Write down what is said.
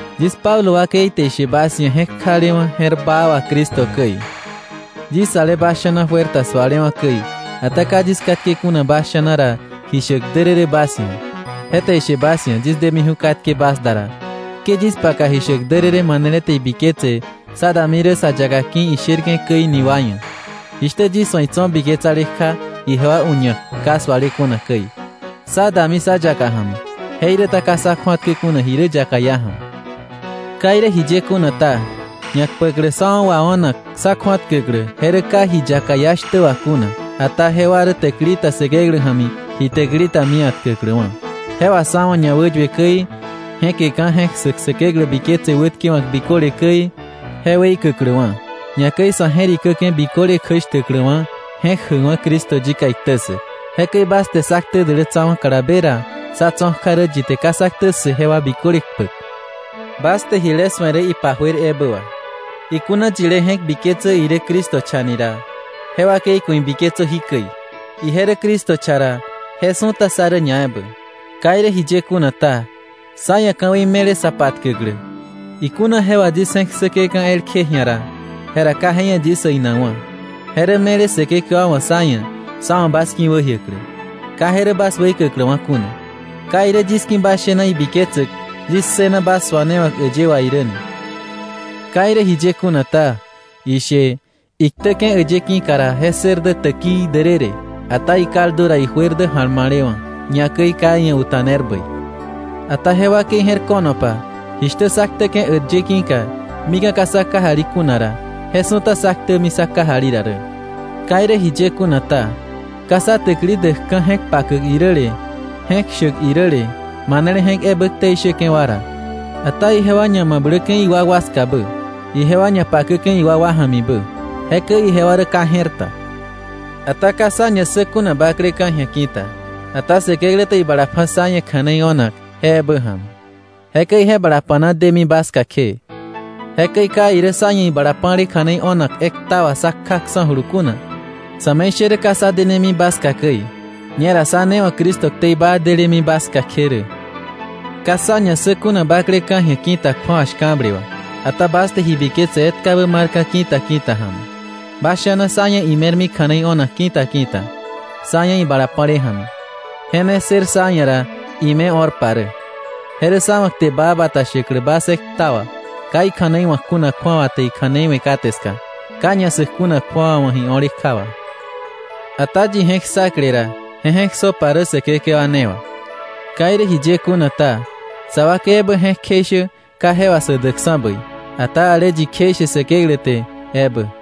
Yis Pablo wakei te ishe bas ia̱ je̱k jalewa̱ je̱r baa wà Cristo käi, yis ale bas sha̱na juer ta sualewa̱ käi, ata ka yis katke kuna bas sha̱na ra ji shäk därërë bas ia̱, je te ishe bas ia̱ yis demiju̱ katke bas da ra, ke yis paka ji shäk därërë manele te ibiketse sá dami rä sa yaka ki̱ isherke̱ käi ni wa ia̱, jishtä yis wa̱ itso̱ biketsale kja ijewa u̱ña̱k ka suale kuna käi. Sá dami sa yaka ja̱mi, jeiräta ka sá kju̱atkä kuna ji rä yaka iá ja̱mi. Ka irä jiye kuna ta, ñakpäklä sá wa̱ wao̱nak sá kju̱atkäklä, je rä ka ji yaka iá shtä wà kuna, ata jewa rä täkili ta Säkeklä ja̱mi ji täkili ta mia̱tkäkläwa̱, je wà sa̱ wa̱ ñawäyue käi, je̱keka̱ je̱k ssäk Säkeklä biketse wätkewa̱k biköle käi, je weikäkläwa̱, ñakäi sa̱ je̱rikäke̱ biköle kjäshtäkläwa̱ je̱k jäkwa̱ Cristo yika iktä ssäk. Jekäi bas te sá ktä dälätsawa̱ kalabe ra, sá tso̱ kja rä yi te ka sá ktä ssë jewa biköle kpäk. Bas te jile su̱e rä ipa juer ebä wà. Ikuna yilé je̱k biketsä irä Cristo cha ni ra, je wakei ku̱ ibiketsö jikäi: Ije rä Cristo cha ra, je su̱ta sá rä ñaebä. Ka irä jiye kuna ta, sá ia̱ ka̱wei me̱le sa patkäklä. Ikuna je wà yis je̱k ssäke̱ka̱ elkje ji̱a ra, jera ka je ia̱ yis äinakwa̱. Je rä me̱le Säkekewa wa̱ sá ia̱ sá wa̱ bas ki̱wäjiäklä, ka je rä bas weikäkläwa̱ kuna. Ka irä yis ki̱ bas shena ibiketsäk yis ssëna bas suanewa̱k äyë wà irä ni. Ka irä jiye kuna ta, ishe: Iktäke̱ äyë ki̱ka ra, je ssër dä täkii därërë; ata ikaldu ra, ijuer dä ja̱lma̱lewa̱, ñakäi ka iia̱ uta̱ner bäi. Ata je wakei je̱r ko̱nopa, jishtä sá ktäke̱ äyë ki̱ka mika̱ ka sá kajali kuna ra, je su̱ta sá ktämi sá kajali ra rä. Ka irä jiye kuna ta, ka sá täkili däkka̱ je̱k pakäk iräle, je̱k shäk iräle, manele je̱k ebä ktei shäke̱ wa ra. Ata ijewa ñamabläke̱ iwakwa skabä, ijewa ñapakäke̱ iwakwa ja̱mibä, jekäi ijewa rä ka je̱r ta. Ata ka sá ña ssä kuna bakleka̱ ji̱a ki̱ta, ata Säkeklä te ibala pja̱ sá ia̱ kja̱nei o̱nak je ebä ja̱mi, jekäi je bala pa̱na demi bas ska kje. Jekäi ka irä sá ia̱ ibala pa̱le kja̱nei o̱nak ekta wà sá kjaksa̱julu kuna, sa̱me̱ishärä ka sá denemi bas ska käi. Ñera sá ne wa̱ Cristo ktei baa delemi bas ska kje rä. Ka sá ña ssä kuna bakleka̱ ji̱a ki̱ta kju̱awa shka̱ble wà. Ata bas te ji biketse etkabä marka̱ ki̱ta ki̱ta ja̱mi, bas sha̱na sá ia̱ ime̱rmi kja̱nei o̱nak ki̱ta ki̱ta, sá ia̱ ibala pa̱le ja̱mi, je ne ssër sá ia̱ ra ime̱ o̱rpa rä. Je rä sá wa̱ kte baa bata shäklä bas ekta wà, ka ikja̱nei wa̱k kuna kju̱awa te ikja̱nei we̱ kate ska, ka ñassäk kuna kju̱awa wa̱ ji o̱le kja wà. Ata yi je̱k ssakle ra, je je̱k ssöpa rä Säkekewa ne wà. Ka irä jiye kuna ta, sa wakei ebä je̱k kjeishä ka je wà sä däkksa̱ bäi, ata ale yi kjeishe Säkeklä te ebä.